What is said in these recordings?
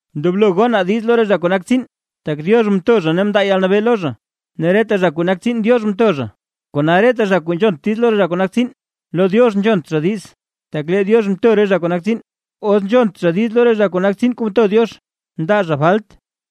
Ndoblo gonaa diiz lo re zha kuu nak tsiin. Tak Diox mto zha ne mndaa Diox yalnabee lo zha, ne reta zha kuu nak tsiin, Diox mtsow ngok zha zha nak tsiin. Kona reta zha kuu nzhont diiz lo re zha kuu nak tsiin, lo Diox nzhont zha diiz, tak lee Diox mto re zha kuu nak tsiin; os nzhont zha diiz lo re zha kuu nak tsiin kuu mto Diox, ndaa zha falt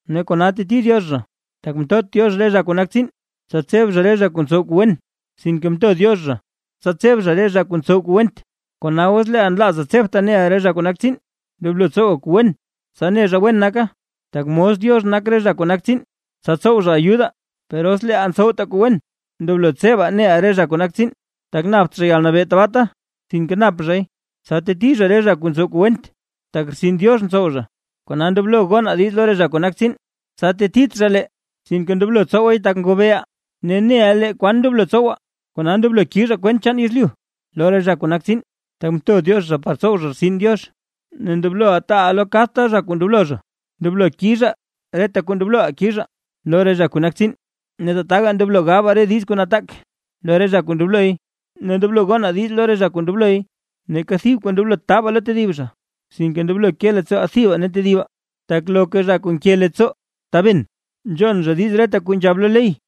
ne kona teti Diox zha. Tak mtot Diox re zha kuu nak tsiin, tsa tseb zha re zha kuu ntsow kuu wen, sinke mto Diox zha tsa tseb zha re zha kuu ntsow kuu went. Kona os leeʼaa nlaazaa tsebtaa neʼaa re zha kuu nak tsiin, ndoblo tsowaa kuu wen, tsa ne zha wen nakaa, tak mos Diox nak re zha kuu nak tsiin, tsa tsow zha ayudaa. Per os leeʼaa ntsowtaa kuu wen, ndoblo tsebaa neʼaa re zha kuu nak tsiin, tak napt zha yalnabee tabaata, sinke nap zhay tsa teti zha re zha kuu ntsow kuu went, tak rtsin Diox ntsow zha. Kona, ndoblo gonaa diiz lo re zha kuu nak tsiin, tsa tetit zha lee, sinke ndoblo tsowaay tak ngobeeʼaa, ne neʼa lee naa kwan ndoblo tsowaa. Kona ndoblo kizhaa kwent chaan yezlyu lo re zha kuu nak tsiin; tak mto Diox par tsow zha rtsin Diox. Ne ndoblo taaʼaa lo kadta zha kuu ndoblo zha. Ndoblo kizhaa reta kuu ndobloʼaa kizhaa lo re zha kuu nak tsiin; ne tataga ndoblo gabaa re diiz nataak lo re zha kuu ndobloy; ne ndoblo gonaa diiz lo re zha kuu ndobloy. Neeka thib kuu ndoblot taabaa lo tedib zha. Sinke ndoblo ke leettsooʼaa thibaa ne tedibaa; tak loka zha kuu nke leettsoo taben, nzhon zha diiz reta kuu nzhab lo ley.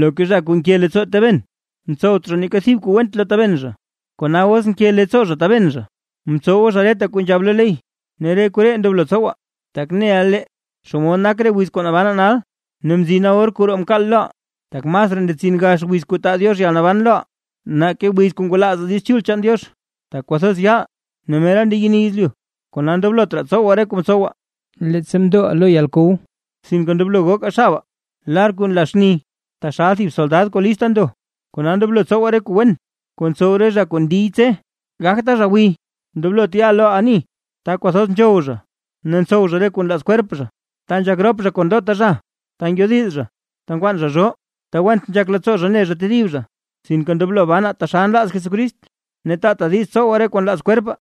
Loka zha kuu nke leettsoo taben tsowt zha neeka thib kuu went lo taben zha; kona os nke leettsoo zha taben zha mtsowa zha reta kuu nzhab lo ley. Ne re koree ndoblo tsowaa, tak neʼa lee xomod nak re wiz kuu nabanaa nal; ne mzina or kuu roo mkaal loʼaa, tak masraa ndetsin gaxa wiz kuu taa Diox yalnaban loʼaa; nake wiz kuu ngwalaazaa Diiz Chul chaan Diox. Tak kwathoz yaal, ne mera ndeyeni yezlyu; kona ndoblot raa tsowaa re kuu mtsowaa, leettsa mndoʼaa lo yalkow, sinke ndoblo gokaa xabaa kuu nla xni, taxal thib soldad kuu lista ndo. Kona ndoblo tsowaa re kuu wen kuu ntsow re zha kuu ndiy tse: Gagtaa zha gwiy, ndoblot ya reʼaa lo ani ta kwathoz nzhow zha ne ntsow zha re kuu nlaaz kwerp zha, ta nzhak rop zha kon ndota zha, ta ngyodiz zha, ta nkwaan zha zhoo, ta went nzhak leettsoo zha ne zha tedib zha. Sinke ndoblo banaa taxal nlaaz Jesucrist, ne taataa diiz tsowaa re kuu nlaaz kwerpaa.